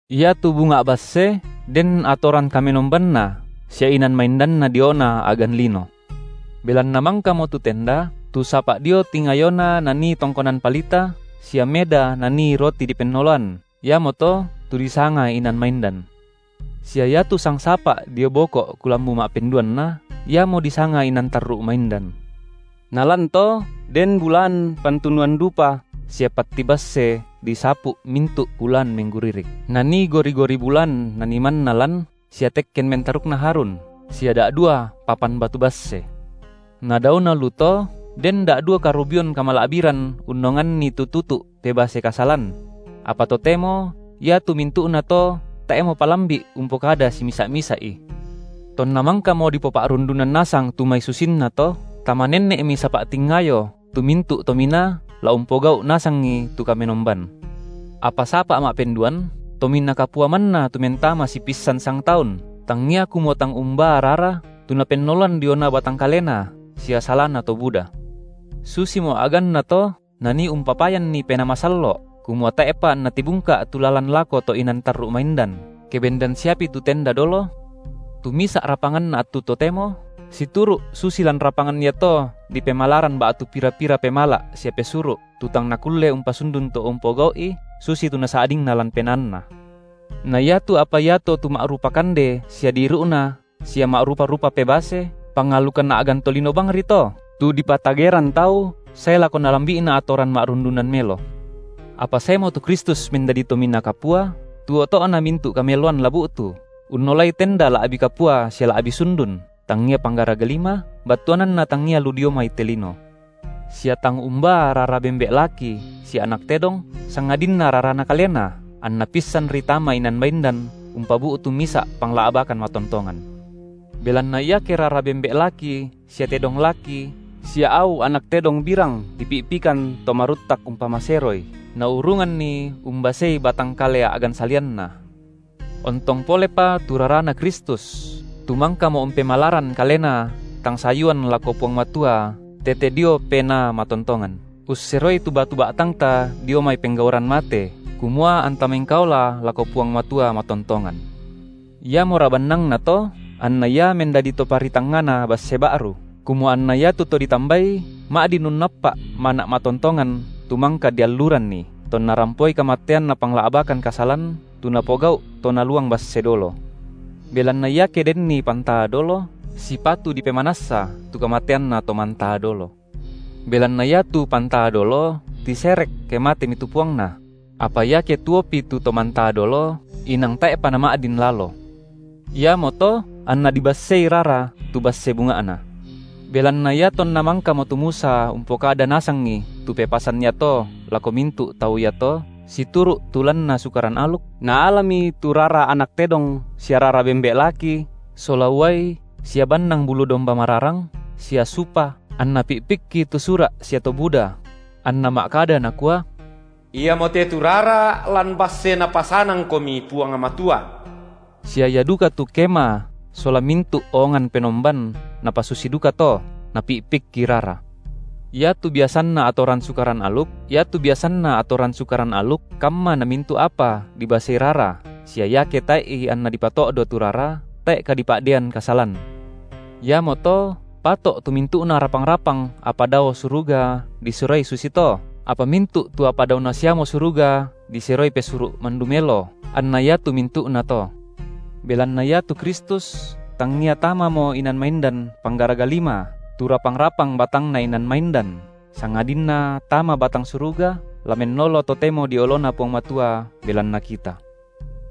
Iatu bunga’ basse den atoran kamenombanna sia inan maindanna diona a’gan lino. Belanna mangkamo tu tenda, tu sapa’ dio tingayona nanii tongkonan palita sia meda nanii roti dipennoloan, iamoto tu disanga inan maindan. Sia iatu sangsapa’ dio boko’ kulambu ma’penduanna iamo disanga inan tarru’ maindan; Nalan to den bulaan pantunuan dupa sia patti basse disapu’ mintu’ bulaan mengguririk, nanii gori-gori bulaan nanii manna lan sia tekken mentarukna Harun, sia da’dua papan batu basse; na daona lu to den da’dua karubion kamala’biran unnonganni tu tutu’ pebase kasalan; apa totemo iatu mintu’nato tae’mo palambi’ umpokada simisa’-misa’i. Tonna mangkamo dipopa’rundunan nasang tu mai susinnato, tama nenne’mi sapa’ tingayo tu mintu’ to minaa la umpogau’ nasangi tu kamenomban; Apa sapa’ ma’penduan, Tominaa Kapua manna tu mentama sipissan sangtaun, tangia kumua tang umbaa rara, tu napennoloan diona batang kalena sia salana to buda. Susimo a’gannato Nanii umpapayanni Penaa Masallo’, kumua tae’pa anna tibungka’ tu lalan lako to’ inan tarru’ maindan, ke bendan siapi tu tenda dolo, tu misa’ rapanganna attu totemo, situru’ susi lan rapangan iato dipemalaran ba’tu pira-pira pemala’ sia pesuru’, tu tang nakulle umpasundun to umpogau’i, susitu nasa’dingna lan penaanna, na iatu apa iato tu ma’rupa kande sia diiru’na sia ma’rupa-rupa pebase, pangalukan a’gan tolino bangri to, tu dipatageran tau sae lako nalambi’na atoran ma’rundunan melo. Apa saemo tu Kristus mendadi Tominaa Kapua, tu oto’na mintu’ kameloan la bu’tu, unnolai tenda la’bi kapua sia la’bi sundun, tangia panggaraga lima, battuananna tangia lu dio mai te lino, sia tang umbaa rara bembe’ laki sia anak tedong, sangadinna raraNa Kalena, anNa pissanri tama inan maindan, umpabu’tu misa’ pangla’bakan matontongan. Belanna iake rara bembe’ laki sia tedong laki sia au anak tedong birang dipi’pikan to maruttak umpamaseroi, naurunganni umbasei batang kale a’gan salianna, ontong polepa tu raraNa Kristus, tu mangkamo umpemalaran Kalena tang sayuan lako Puang Matua tete dio Penaa matontongan, usseroi tu batu ba’tangta dio mai penggauran mate, kumua anta mengkaola lako Puang Matua matontongan. Iamora bannangnato anna Ia mendadi Toparitangngana basse ba’ru, kumua anna iatu to ditambai ma’din unnappa’ mana’ matontongan tu mangka dialluranni, tonna rampoi kamatean Napangla’bakan kasalan tu napogau’ to naluang basse dolo. Belanna iake denni pantaa dolo, sipatu dipemanassa tu kamateanna to mantaa dolo. Belanna iatu pantaa dolo, tiserek, ke matemi tu puangna; apa iake tuopi tu to mantaa dolo, inang tae’pa nama’din lalo. Iamoto anna dibassei rara tu basse bunga’na. Belanna iatonna mangkamo tu Musa umpokada nasangi tu pepasan iato lako mintu’ tau iato situru’ tu lanna Sukaran aluk, naalami tu rara anak tedong sia rara bembe’ laki, sola uai sia bannang bulu domba mararang, sia supa, anna pi’pikki tu sura’ sia to buda; anna ma’kada nakua: Iamote tu rara lan basse Napasanangkomi Puang Matua. Sia ia duka tu kema sola mintu’ oongan penomban napasusi dukato napi’pikki rara. Iatu biasanna atoran Sukaran aluk, kamma namintu’ apa dibasei rara, sia iake tae’i anna dipato’do tu rara, tae’ kadipa’deian kasalan. Iamoto pato’ tu mintu’na rapang-rapang apa dao suruga diseroi susito, apa mintu’ tu apa daona siamo suruga diseroi pesuru’ mandu melo anna iatu mintu’nato. Belanna iatu Kristus tangia tamamo inan maindan panggaraga lima, tu rapang-rapang batangna inan maindan, sangadinna tama batang suruga, la mennolo totemo dio oloNa Puang Matua belanna kita.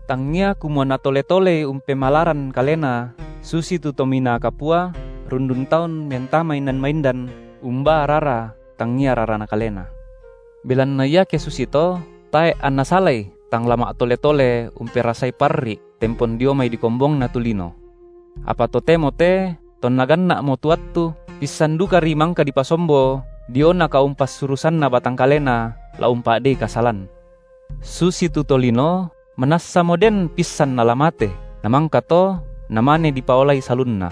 Tangia kumua Natole-tolei umpemalaran Kalena susitu Tominaa Kapua rundun taun mentama inan maindan umbaa rara tangia rarana kalena. Belanna iake susito, tae’ anna salai tang la ma’tole-tole umperasai parri’ tempon dio mai dikombongna tu lino. Apa totemo te tonna ganna’mo tu attu, pissan dukari mangka dipasombo diona kaumpassurusanna batang kaleNa la umpa’dei kasalan. Susitu tolino manassamo den pissan nala mate, namangkato namane dipaolai salunna,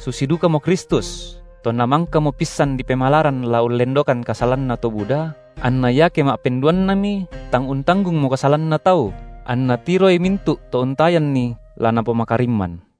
susi dukamo Kristus, tonna mangkamo pissan dipemalaran la ullendokan kasalanna to buda, anna iake ma’penduannami, tang untanggungmo kasalanna tau, anNa tiroi mintu’ to untayanNi la napomakarimman.